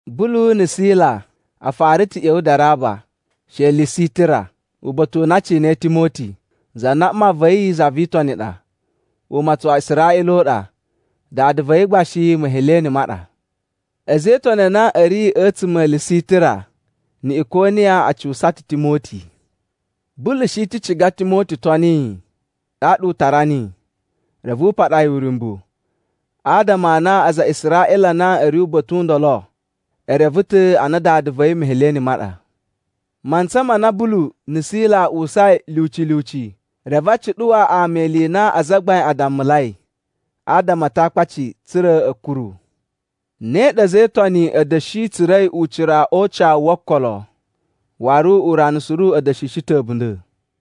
Bulu na̱ Sila a fara ta̱ ꞌya̱wa̱ Daraba she Lisitira uba̱ta̱ u na a cinai Timoti, za na mma va̱ yi za vi Itoni ɗa, umatsun wa Israꞌila u ɗa. Dada va̱ yi gba shi Meheleni ma ɗa. A̱za̱ e Itoni a na a̱ ri a̱tsuma̱ a Lisitira na̱ Ikoniya a cuwusa ta̱ Timoti. Bulu shi ta̱ ciga Timoti toni yi, ɗaɗa u tara niyi. Reve u paɗa yi uryumbu, adama a na aza a Israꞌila a na a̱ ri uba̱ta̱ u ndolo, e reve ta̱ a na dada va̱ yi Meheleni ma ɗa. Mantsa ma na Bulu na̱ Sila a uwusai lyuci lyuci, reve a cuɗuwa ama ili i na azagbain a dammulai adama a Atakpaci, tsa̱ra̱ a̱ kuru. Ne ɗa a̱za̱ e Itoni a̱ da̱shi tsura̱i ucira o ucawu wo okolo, waru urana suru a̱ da̱shishi ta̱ a̱bunda̱.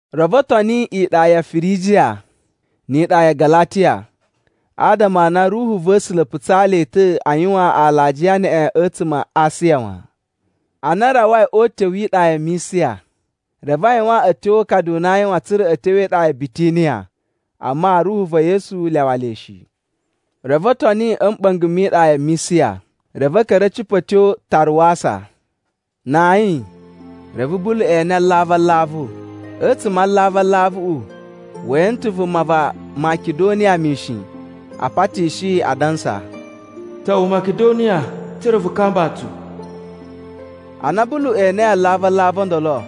Reve o toni iɗa ya Firijiya ni iɗa ya Galatiya, adama a na Ruhu va̱ A̱sula̱ putsaa le ta̱ a yuwan alajiya neꞌen a̱tsuma̱ a Asiya wan. Ana a rawai o utyo wi iɗa ya Misiya, reve a yuwan a̱tyo o ukadu u na a yuwan tsa̱ra̱ a̱ tyo e iɗa ya Bitiniya, amma Ruhu va̱ Yesu lyawa le shi. Reve o toni a̱ mɓa̱nga̱ mi iɗa ya Misiya, reve a̱ ka̱ra̱ a̱ cipa̱ a̱ tyo Taruwasa. Na ayin, reve Bulu ene alavu alavu. A̱tsuma̱ a alavu alavuꞌu we ene ta̱ vuma va Makidoniya mishin, a patishi yi, adansa, “Ta̱wa̱ Makidoniya tsa̱ra̱ vu kamba tsu.” Ana Bulu enei alavu alavu o ndolo,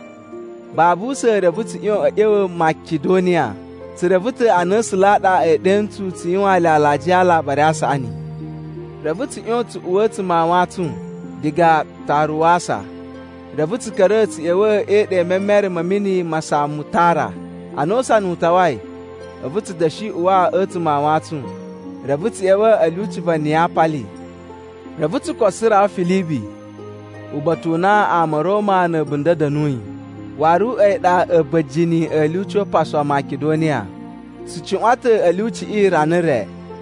babu usa̱n reve tsu ꞌyon a̱ ꞌya̱wa̱ Makidoniya, tsu reve ta̱ a na A̱sula̱ a ɗa e ɗe ntsu tsu yuwaan le alajiya a Alabari a Saꞌani. Reve tsu ꞌyon tsu uwa a̱tsuma̱ a wantsun diga Taruwasa, reve tsu ka̱ra̱ tsu ꞌya̱wa̱ e iɗa i memere ma̱ mini ma Samutara. Ana usana u tawai, a̱vu tsu da̱shi uwa a̱tsuma̱ a wantsun, reve tsu ꞌya̱wa̱ a̱ lyuci va Niyapali. Reve tsu koso rawa Filibi uba̱ta̱ u na ama a̱ Roma na̱ a̱bunda̱ a̱ da̱nuyi, waru a̱yi ɗa a̱ba̱jini a̱ lyuci upasu wa Makidoniya. Tsu cuꞌwan ta̱ a̱ lyuciꞌi rana re.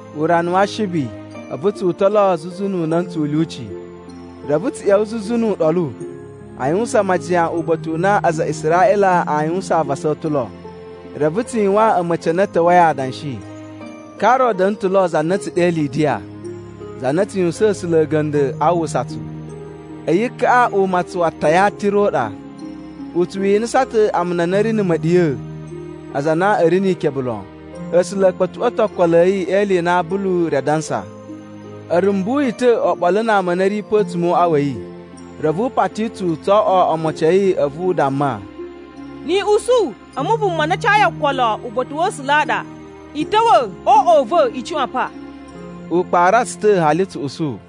Urana wa Ashibi, a̱vu tsu uta̱ lo zuzu nu una̱ntsu u lyuci, reve tsu ꞌya̱wa̱ zuzu nu uɗolu a yuwusan majiyan uba̱ta̱ u na aza a Israꞌila aa yuwan avasa o ta̱ lo. Reve tsu yuwaan a̱ma̱ci a na a̱ ta̱wa̱i adanshi. Ka ro da̱na̱ ta̱ lo za na a̱ tsu ɗe Lidiya, za na tsu yuwusaan A̱sula̱ a̱ga̱nda̱ a uwwusa tsu. A̱yi kaꞌa umatsun wa Tayatira u ɗa. U tsu winisa ta̱ amuna a na a̱ ri na̱ ma̱ɗiya̱, aza a na a̱ ri ni ikebe lon. A̱sula̱ a̱ kpa̱tuꞌwa̱ ta̱ okolo a̱ yi e ili i na Bulu ri adansa. A̱ rumbu yi ta̱ oɓolo na ama a na a̱ ri pe a̱tsuma̱ o uꞌwa wa̱ yi, reve u pati tsu tso oꞌwo omocin a̱ yi a̱vu u damma, “Ni i usu a̱mu vuma na cayi okolo uba̱ta̱ wa̱ A̱sula̱ a ɗa, i ta̱wa̱ o uꞌwa u va̱ i cuꞌwan pa.” U kpara tsu ta̱ hali tsu usu.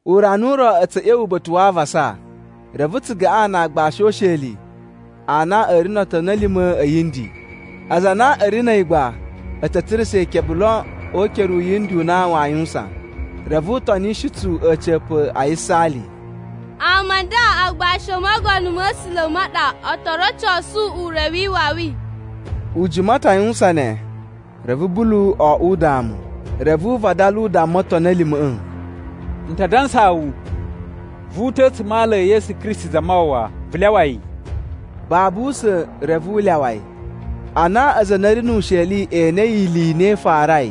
Urana u ro a̱tsu a̱ ꞌya̱wa̱ uba̱ta̱ wa avasa, reve tsu gaꞌan na aagbashi o usheli a na a̱ ri no otoni a̱ lima̱ a̱ yindi. Aza a na a̱ ri na̱ a̱yi gba a̱ ta̱ tsurusa̱ ikebe lon o ukere u yindi u na waa yuwusan. Reve u tonishi tsu a̱ca̱pa̱ a yisaali, “Ama a nda agbashi o Mogono ma̱ A̱sula̱ ma ɗa o to rocosu ure wi iwawi.” U jima ta̱ a yuwusan ne. Reve Bulu oꞌwo udamu, reve u vadala u damma otoni a̱ lima̱ꞌa̱, “N ta dansaa wu, vu uta̱ a̱tsuma̱ a ala e Yesu Kristi Zamawawa, vu lyawa yi.” Babu usa̱n reve u lyawa yi. Ana aza a na a̱ ri nu usheliꞌi e enei ili i na i farai,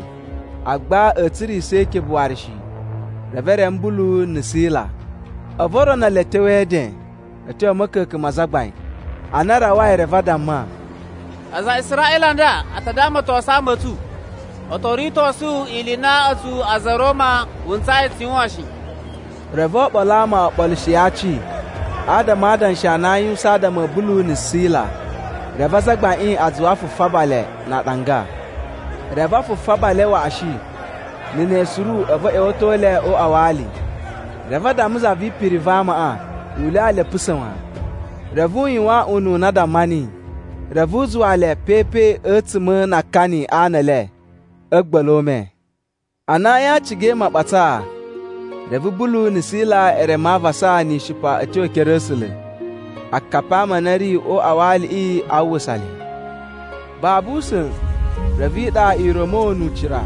agba a̱a̱ tsurisa̱ ikebe waru shi, reve e reme Bulu na̱ Sila. A̱vu o rono le a̱ tyo e eden a̱ tyo a̱ ma̱ka̱ka̱n ma azagbain. Ana a rawai, reve a damma, “Aza a Israꞌila a nda a ta damatosun ama a̱ tsu. O to ritosu ili i na a̱tsu a̱za̱ a̱ Roma wu ntsayi tsu yuwan shi.” Reve oɓolo a ama o ɓolushi aci adama a adanshi a na aa yuwusan adama a̱ Bulu na̱ Sila. Reve azagbaiꞌin a zuwa a fufaba le na aɗanga. Reve a fufaba le waꞌashi, na̱ ne suru a̱vu a̱ ꞌya̱wa̱to le o uꞌwa wa ali. Reve a damma za vi ipiri va amaꞌa u lyawa le a̱a̱ pusa̱ wan. Reve u yuwan ununa a damma niyi. Reve u zuwa le pe pe a̱tsuma̱ na akani a ana e le a̱ a̱gba̱la̱ o ume. Ana ayin a cigai maɓatsaa, reve Bulu na̱ Sila e reme avasa ni ishipa a̱ tyo e ekere a̱ A̱sula̱. Akapi a ama a na a̱ ri o uꞌwa wa aliꞌi a uwwusa le. Babu usa̱n reve iɗa i ra̱mo nu ucira.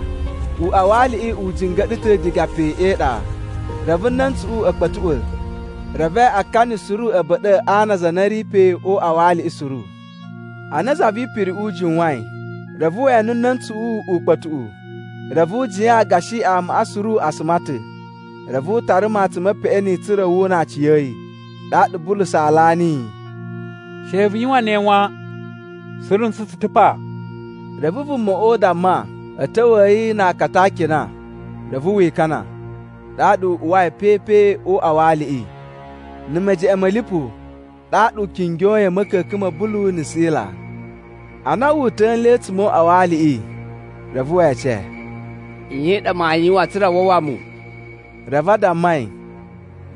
Uꞌwa wa aliꞌi u jinga̱ɗa̱ ta̱ diga pe e iɗa. Reve na̱ntsuꞌu a̱ kpa̱tuꞌwa̱, reve akani suru a̱ ba̱ɗa̱ a ana a aza a na a̱ ri pe o uꞌwa wa aliꞌi suru. Ana za vi ipiriꞌi u jiwain, reve we ene na̱ntsuꞌu ukpa̱tuꞌu, reve u jiyan gashi amaꞌa suru a suma ta̱. Reve u tara matsun me peꞌeni tsa̱ra̱ wu una aciya̱yi. Ɗaɗa Bulu saalaa niyi, “She vu yuwan ne wan! Suru ntsu tsu ta̱ pa!” Reve vumaꞌa u damma a̱ ta̱wa̱a̱ yi na akata a akina reve wi ikana, ɗaɗa u uwai pe pe o uꞌwa wa aliꞌi. Na̱ mejeꞌen ma̱ lipu ɗaɗa u kingyoi a̱ ma̱ka̱ka̱n ma̱ Bulu na̱ Sila. Ana wu uta̱a̱ nle a̱tsuma̱ o uꞌwa wa aliꞌi, reve we ece, “Nye i ɗa maa yuwan tsa̱ra̱ a wawa mu?” Reve a damma yi,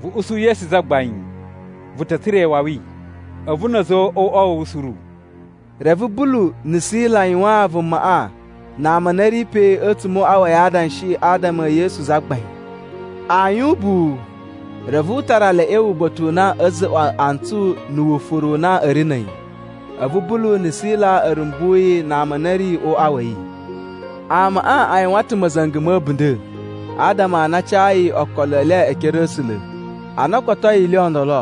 “Vu usu Yesu Zagbain, vu ta̱ tsura̱ iwawi, a̱vu na̱ a̱za̱ o uꞌwa a̱ wu suru.” Reve Bulu na̱ Sila yuwaan vumaꞌa na ama a na a̱ ri pe a̱tsuma̱ o uꞌwa wa̱ yi adanshi adama e Yesu Zagbain. Ayin ubuwu, reve u tara le a̱ ꞌya̱wa̱ uba̱ta̱ u na a̱ za̱za̱ꞌwa̱ antsu na̱ wufuru u na a̱ ri na̱ a̱yi. A̱vu Bulu na̱ Sila a̱ rumbu yi na ama a na a̱ ri o uꞌwa wa̱ yi. Amaꞌa a yuwan ta̱ ma̱za̱nga̱ ma̱ a̱bunda̱ adama a na a cayi okolo e le e ekere a̱ A̱sula̱. Ana o kotoi ili i ndolo,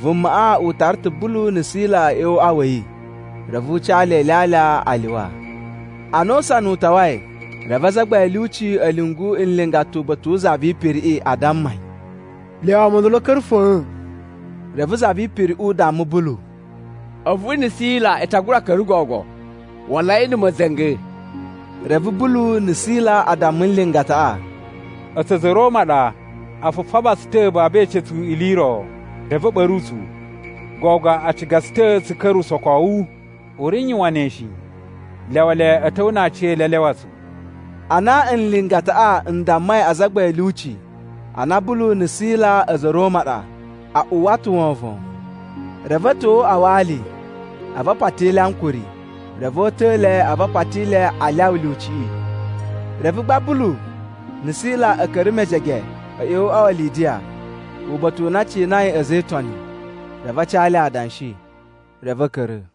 vumaꞌa u tara ta̱ Bulu na̱ Sila a̱ ꞌya̱wa̱ o uꞌwa wa̱ yi, reve u ca le ilyalya a lyuwa. Ana usana u tawai, reve azagbain a̱ lyuci a̱ lyungu nlingata uba̱ta̱ wu za vi ipiriꞌi a damma yi, “Lyawa ama o ndolo a̱ ka̱ra̱ fa̱a̱n.” Reve za vi ipiriꞌi u damma Bulu, “A̱vu na̱ Sila i ta gura ka̱ra̱ gogo. Walai na̱ ma̱za̱nga̱!” Reve Bulu na̱ Sila a damma nlingataꞌa, “A̱tsu a̱za̱ a̱ Roma ɗa. A fufaba tsu ta̱ babu e ece tsu ili i ro, reve a̱ ɓa̱ru tsu. Gogo a ciga tsu ta̱ tsu ka̱ra̱ usokowu? U ri n yuwan ne shi! Lyawa le a̱ ta̱wa̱ na aciyele a lyawa tsu!” Ana nlingataꞌa n dammai azagbain a̱ lyuci a na Bulu na̱ Sila a̱za̱ a̱ Roma ɗa, a uwwa ta̱ wovon. Reve a̱ ta̱wa̱ o uꞌwa wa ali a̱vu a pati le ankuri. Reve o uta̱a̱ le a̱vu a pati le a lyawa lyuciꞌi. Reve gba Bulu na̱ Sila a̱ ka̱ra̱ mejege a̱ ꞌya̱wa̱ o uꞌwa wa Lidiya, uba̱ta̱ u na a cinai a̱za̱ e Itoni, reve a ca le adanshi. Reve a̱ ka̱ra̱.